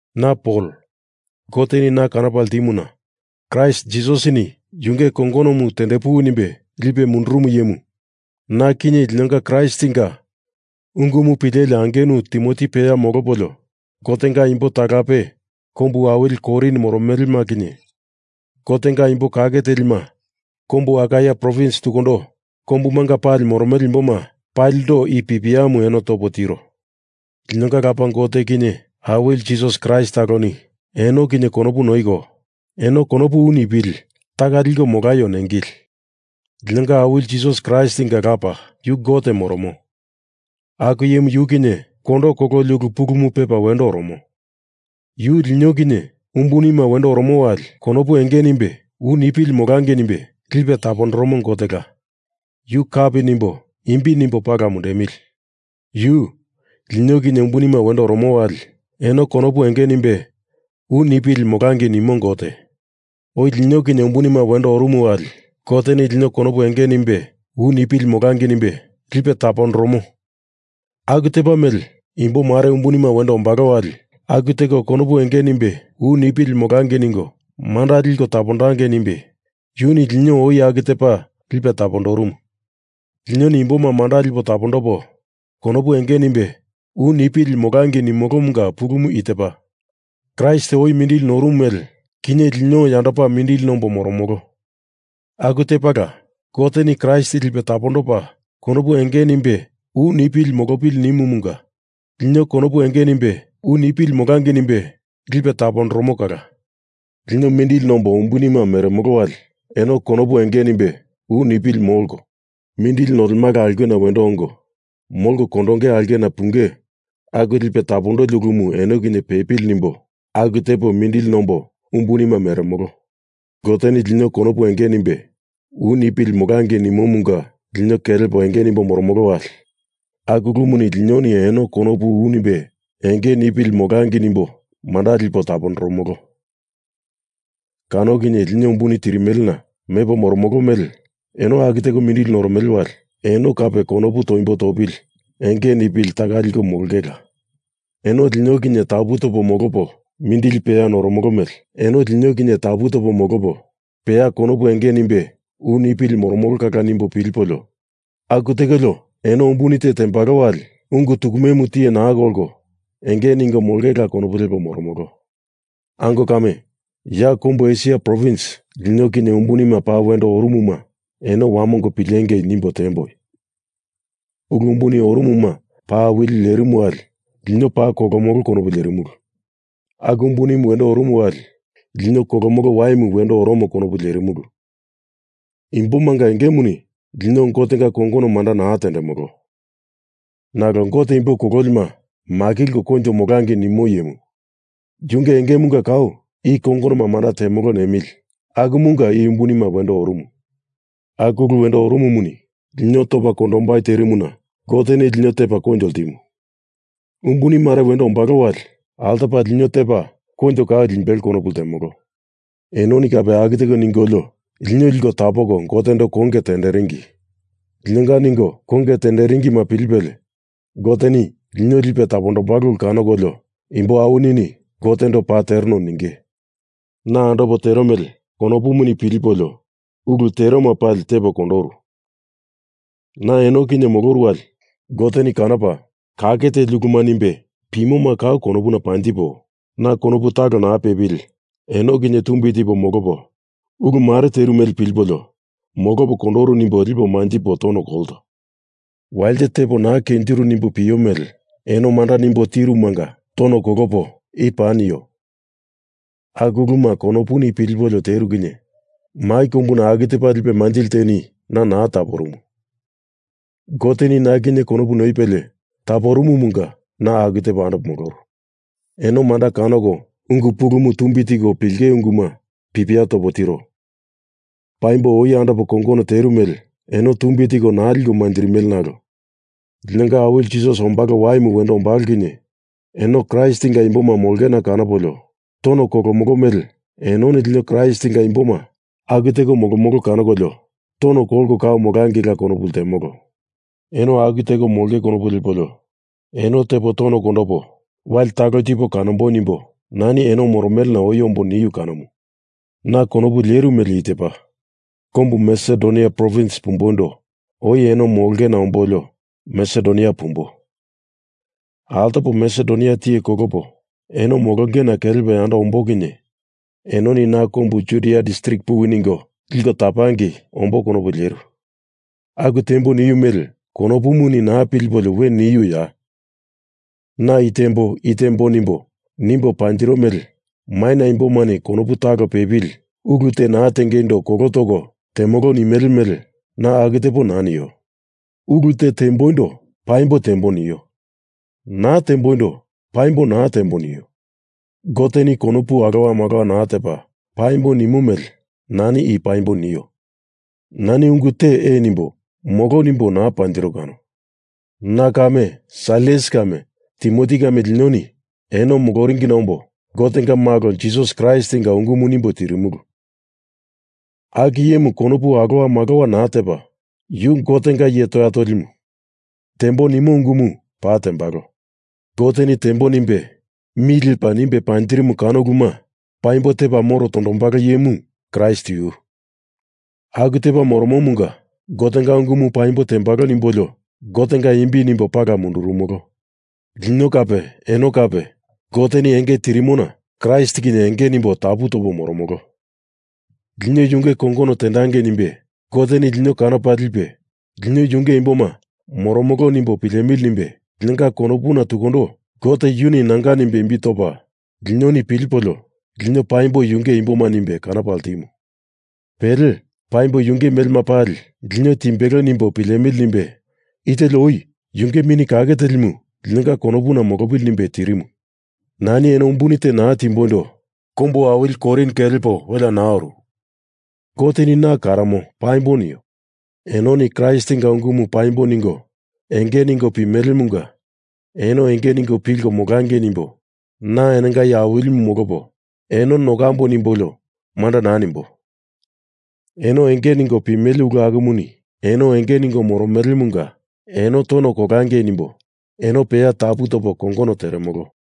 Na Pol, Goteni na kanopa ltimuna Kraist Jisasini yunge kongonomu tendepuwi nimbe lipe mundurumu iyemu, na kinye linonga Kraistinga ungumu pileli angenu Timoti peya molopolio Gotenga imbo talape kombu awili Korin moromelema kinye, Gotenga imbo kake telima kombu Akaia provins tukundo kombumanga pali moromele imboma palindo i pipiamu eno topo tiro. Linonga Lapa Gote kinye Awili Jisas Kraist taloni eno kinye konopu noiko, eno konopu u nipili taka liko molaio nengili. Linonga Awili Jisas Kraistinga Lapa, yu Gote moromo, aku iyemu yu kinye kondo kololi ulu pulumu pepa wendo oromo, yu lino kinye umbunima wendo oromo wali konopu enge nimbe u nipili molangei nimbe lipe tapondoromo Gotela, yu kapi nimbo imbi nimbo pala mundemili. Yu, lino kinye umbunima wendo oromo wali eno konopu enge nimbe u nipili molangei nimo Gote. Oi lino kinye umbunima wendo oromo wali Goteni lino konopu enge nimbe u nipili molangei nimbe lipe tapondoromo aku tepa mele imbo mare umbunima wendo ombalo wali aku teko konopu enge nimbe u nipili molangei ningo manda liko tapondangei nimbe yuni lino oi aku tepa lipe tapondorumu. Linoni imboma manda lipo tapondopo konopu enge nimbe u nipili molangei nimolomunga pulumu i tepa. Kraist oi mindili norumu mele, kinye lino yandopa mindili nombo moromolo, aku tepala Goteni Kraist lipe tapondopa konopu enge nimbe u nipili molopili nimumunga lino konopu enge nimbe u nipili molangei nimbe lipe tapondoromo kala. Lino mindili nombo umbunima meremolo wali eno konopu enge nimbe u nipili molko, mindili nolemala aulkena wendo ongo, molko kondonge aulkena punge aku lipe tapondoli ulumu eno kinye pepili nimbo aku tepo mindili nombo umbunima meremolo. Goteni lino konopu enge nimbe u nipili molangei nimomunga lino kelepo enge nimbo moromolo wali aku ulumuni linoni eno konopu u nimbe enge nipili molangei nimbo manda lipo tapondoromolo kano kinye lino umbuni tirimelena mepo moromolo mele eno aku teko mindili noromele wali eno kape konopu toimbo topili enge nipili taka liko molongela. Eno lino kinye tapu topo molopo, mindili peya noromolo mele eno lino kinye tapu topo molopo peya konopu enge nimbe u nipili moromolo kala nimbo pilipolio aku tekolio eno umbuni te tembalo wali ungu tukumemu tiye naa kolko enge ningo molongela konopu lepo moromolo. Ango kame, ya kombu Esia provins lino kinye umbunima paa wendo orumuma eno wamongo pilengei nimbo tiemboi. Ulu umbuni orumuma paa awili lerimu wali lino paa kolomolo konopu lierimulu. Aku umbuni wendo orumu wali lino kolomolo waimu wendo oromo konopu lierimulu. Imbomanga engemuni lino Gotenga kongono manda naa tendemolo. Nalo Gote imbo kololima makilko koinjo molangei nimo iyemu, yunge engemunga kau i kongono manda temolo nemili akumunga i umbunima wendo orumu. Aku ulu wendo orumumuni lino topa kondombai terimuna Goteni lino tepa koinjo ltimu. Umbuni mare wendo ombalo wali altopala lino tepa koinjo kau limbelo konopu ltemolo. Enoni kape aku teko ningolio lino liko tapoko Gotendo konge tenderingi. Linonga ningo konge tenderingima pilipelie Goteni lino lipe tapombalo ulu kanokolio imbo awinini Gotendo paa tereno ninge. Na andopo tero mele konopuni pilipolio ulu teruma pali tepo kondoru. Na eno kinye moloru wali Goteni kanopa kake teli uluma nimbe pimoma kau konopuna panjipo, na konopu talo naa pepili eno kinye tumbi tipo molopo ulu mare teru mele pilipolio molopo kondoru nimbo lipo manjipo tono kolto. Walite tepo naa kenjiru nimbo pio mele eno manda nimbo tirumanga tono kolopo i paa nio. Aku uluma konopuni pilipolio teru kinye mai kombuna aku tepa lipe manjili teni na naa taporumu. Goteni na kinye konopu noipelie taporumumunga na aku tepo andopo moloru. Eno manda kanoko ungu pulumu tumbi tiko pilinge unguma pipia topo tiro. Paimbo oi andopo kongono teru mele eno tumbi tiko naa liko manjirimele nalo linonga Awili Jisas ombalo waimu wendo ombalo kinye eno Kraistinga imboma molongena kanopolio tono kolomolo mele enoni lino Kraistinga imboma aku teko molomolo kanokolio tono kolko kau molangeila konopu ltemolo. Eno aku teko molonge konopu lepolio eno tepo tono kondopo wali talo tipo kanomboi nimbo nani eno moromelena oi ombo niu kanomu. Na konopu leru mele i tepa. Kombu Masedonia provins pumboindo oi eno molongena ombolio, Masedonia pumbo. Altopa Masedonia tiye kolopo eno molongena kelepo yando ombo kinye enoni na kombu Judia distrik puwi ningo liko tapangei ombo konopu leru. Aku tembo niu mele konopuni naa pilipolio we niuya? Na i tembo, i tembo nimbo, nimbo panjiro mele maina imbomani konopu talo pepili ulu te naa tengeindo kolo toko temolo nimele mele na aku tepo naa nio. Ulu te temboindo paimbo tembo nio. Naa temboindo paimbo naa tembo nio. Goteni konopu alowa malowa naa tepa paimbo nimo mele nani i paa paimbo nio. Nani ungu te ee nimbo molo nimbo naa panjiro kano. Na kame Sailas kame Timoti kame linoni eno moloringina ombo Gotenga Malo Jisas Kraistinga ungumu nimbo tirimulu, aku iyemuni konopu alowa malowa naa tepa, yu Gotenga iye toya tolimu. Tembo nimo ungumu paa tembalo. Goteni tembo nimbe mi lepa nimbe panjirimu kano uluma paimbo tepa moro tondombalo iyemu Kraist yu. Aku tepa moromomunga Gotenga ungumu paimbo tembalo nimbolio Gotenga imbi nimbo pala mundurumolo. Lino kape eno kape Goteni enge tirimona Kraist kinye enge nimbo tapu topo moromolo. Lino yunge kongono tendangei nimbe Goteni lino kanopa lipe, lino yunge imboma moromolo nimbo pilemili nimbe linonga konopuna tukundo Gote yuni nanga nimbe imbi topa, linoni pilipolio lino paimbo yunge imboma nimbe kanopa ltimu. Pele, paimbo yunge melema pali lino timbelo nimbo pilemili nimbe i teli oi yunge Mini Kake Telimu linonga konopuna molopili nimbe tirimu. Nani eno umbuni te naa timboindo kombu awili Korin kelepo welea naa oru. Goteni na karomo paimbo nio. Enoni Kraistinga ungumu paimbo ningo enge ningo pimelemunga eno enge ningo pilko molangei nimbo na enonga iye awilimu molopo, eno nokambo nimbolio manda naa nimbo. Eno enge ningo pimele ulu akumuni eno enge ningo moromelemunga eno tono kolangei nimbo eno peya tapu topo kongono teremolo.